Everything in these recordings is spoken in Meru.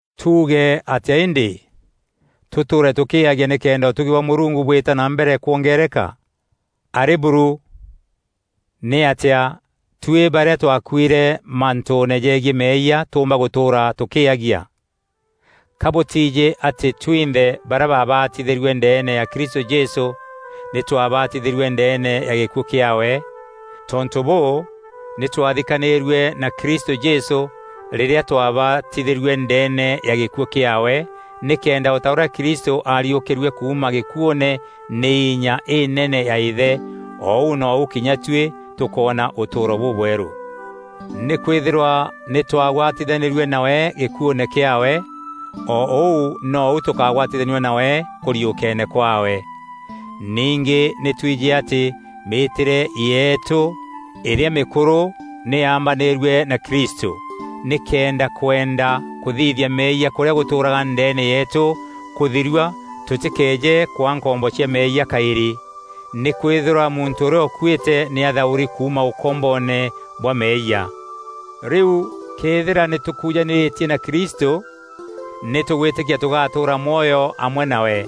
Tuuge atîa îndî? Tûtûûre tûkîîagia nîkenda ûtugi bwa Mûrungu bwîta na mbere kwongeereka? Arî buru! Nîatîa tuî barîa twakuîre mantûûne jegiî meeyia, tûûmba gûtûûra tûkîîagia? Ka bûtiijî atî twinthe barîa baabatithîrue ndeene ya Kristû Jesû, nî twabatithîrue ndeene ya gîkuû kîaawe? Tontû bûû, nî twathikanîîrue na Kristû Jesû rîrîa twabatithîrue ndeene ya gîkuû kîaawe, nîkenda o ta ûrîa Kristû aariûkîrue kuuma gîkuûne nî inya inene ya Îthe, o ûu nou kinya tuî tûkoona ûtûûro bûbwerû. Nîkwîthîrwa nî twagwatithanîrue nawe gîkuûne kîaawe, o ûu nou tûkagwatithanua nawe kûriûkeene kwaawe. Ningî nî tuîjî atî mîîtîre yeetû îrîa mîkûrû nî yaambanîîrue na Kristû, nîkenda kwenda kûthithia meeyia kûrîa gûtûûraga ndeene yeetû kûthirua tûtîkeeje kwaa nkombo cia meeyia kaîrî. Nîkwîthîrwa muntû ûrîa ûkuîte nî athaûri kuuma ûkomboone bwa meeyia. Rîu këethîra nî tûkujanîrîtie na Kristû, nî tûgwîtîkia tûgatûûra mwoyo amwe nawe.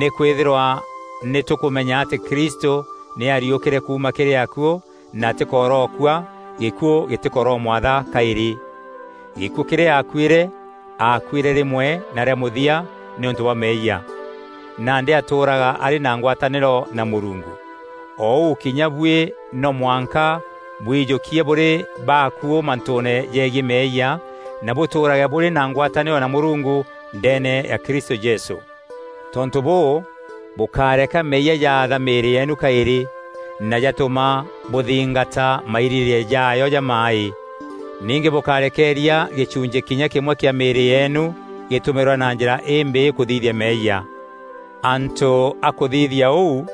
Nîkwîthîrwa nî tûkûmenya atî Kristû nî aariûkîre kuuma kîrî akuû na atîkorokua; gîkuû gîtîkoromwatha kaîrî. Gîkuû kîrîa aakuîre, aakuîre rîmwe na rîa mûthia nîûntû bwa meeyia. Nandî atûûraga arî na ngwatanîro na Mûrungu. O ûu kinya buî no mwanka bwijûkie bûrî bakuû mantûûne jegiî meeyia, na bûtûûrage bûrî na ngwatanîro na Mûrungu ndeene ya Kristû Jesû. Tontû bûû, bûkáreka meeyia jaatha mîîrî yeenu kaîrî, na jatûma bûthingata mairîrîîria jaayo jamaaî. Ningî bûkárekeeria gîchunchî kinya kîmwe kîa mîîrî yeenu gîtûmîrwa na njîra imbîî kûthithia meeyia. Antû a kûthithia ûu,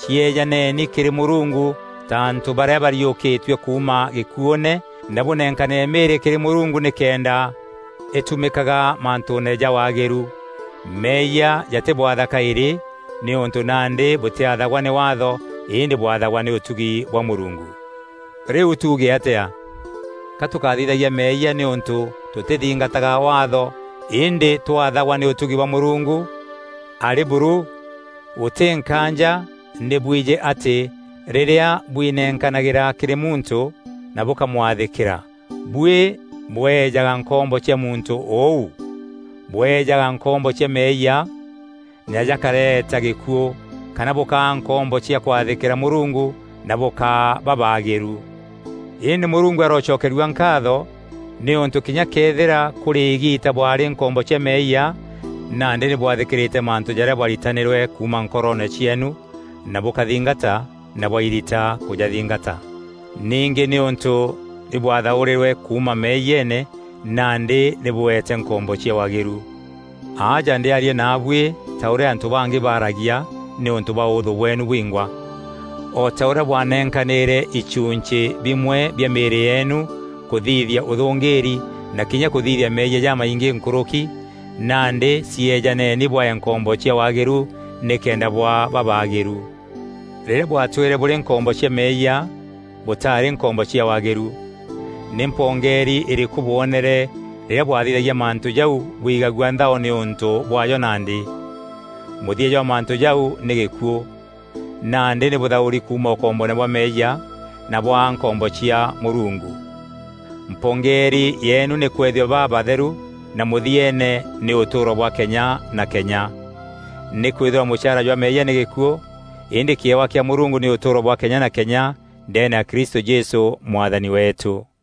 cieejaneni kîrî Mûrungu ta antû barîa bariûkîtue kuuma gîkuûne, na bûnenkanîre mîîrî kîrî Mûrungu nîkenda îtumîkaga mantûûne ja waagîru. Meeyia jatîbwatha kaîrî, nîûntû nandî bûtîathagwa nî Waatho îndî bwathagwa nî ûtugi bwa Mûrungu. Rîu tuuge atîa? Ka tûkathithagia meeyia nîûntû tûtîthingataga Waatho îndî twathagwa nî ûtugi bwa Mûrungu? Arî buru! Gûtî nkaanja nî bwijî atî rîrîa bwinenkanagîra kîrî muntû na bûkamwathîkîra, buî bweejaga nkombo cia muntû ûu. Bweejaga nkombo cia meeyia na jakareeta gîkuû, kana bûkaa nkombo cia kwathîkîra Mûrungu na bûkaa babaagîru. Îndî Mûrungu arocokerua nkaatho, nîûntû kinya këethîra kûrî îgiita bwaarî nkombo cia meeyia, nandî nî bwathîkîrîte mantû jarîa bwaritanîrwe kuuma nkoro cieenu na bûkathingata na bwairita kûjathingata. Ningî nîûntû nî bwathaûrîrwe kuuma meeyiene, nandî nî bûeete nkombo cia waagîru. Aja ndîaria naabuî ta ûrîa antû bangî baaragia nîûntû bwa ûûthû bweenu bwingwa. O ta ûrîa bwanenkanîre ichunchî bimwe bia mîîrî yeenu kûthithia ûthûngîrî na kinya kûthithia meeyia jamaingî nkûrûki, nandi cieejaneni bwee nkombo cia waagîru nîkenda bwaa babaagîru. Rîrîa bwatwîre bûrî nkombo cia meeyia, bûtaarî nkombo cia waagîru. Nî mpongeeri îrîkû bwonere rîrîa bwathithagia mantû jau bwigagua nthao nîûntû bwaajo nandî? Mûthia jwa mantû jau nî gîkuû! Nandî nî bûthaûri kuuma ûkomboone bwa meeyia, na bwaa nkombo cia Mûrungu. Mpongeeri yeenu nî kwethua babatheru na mûthieene nî ûtûûro bwa kenya na kenya. Nîkwîthîrwa mûchaara jwa meeyia nî gîkuû; îndî kîewa kîa Mûrungu nî ûtûûro bwa kenya na kenya ndeene ya Kristû Jesû Mwathani weetû.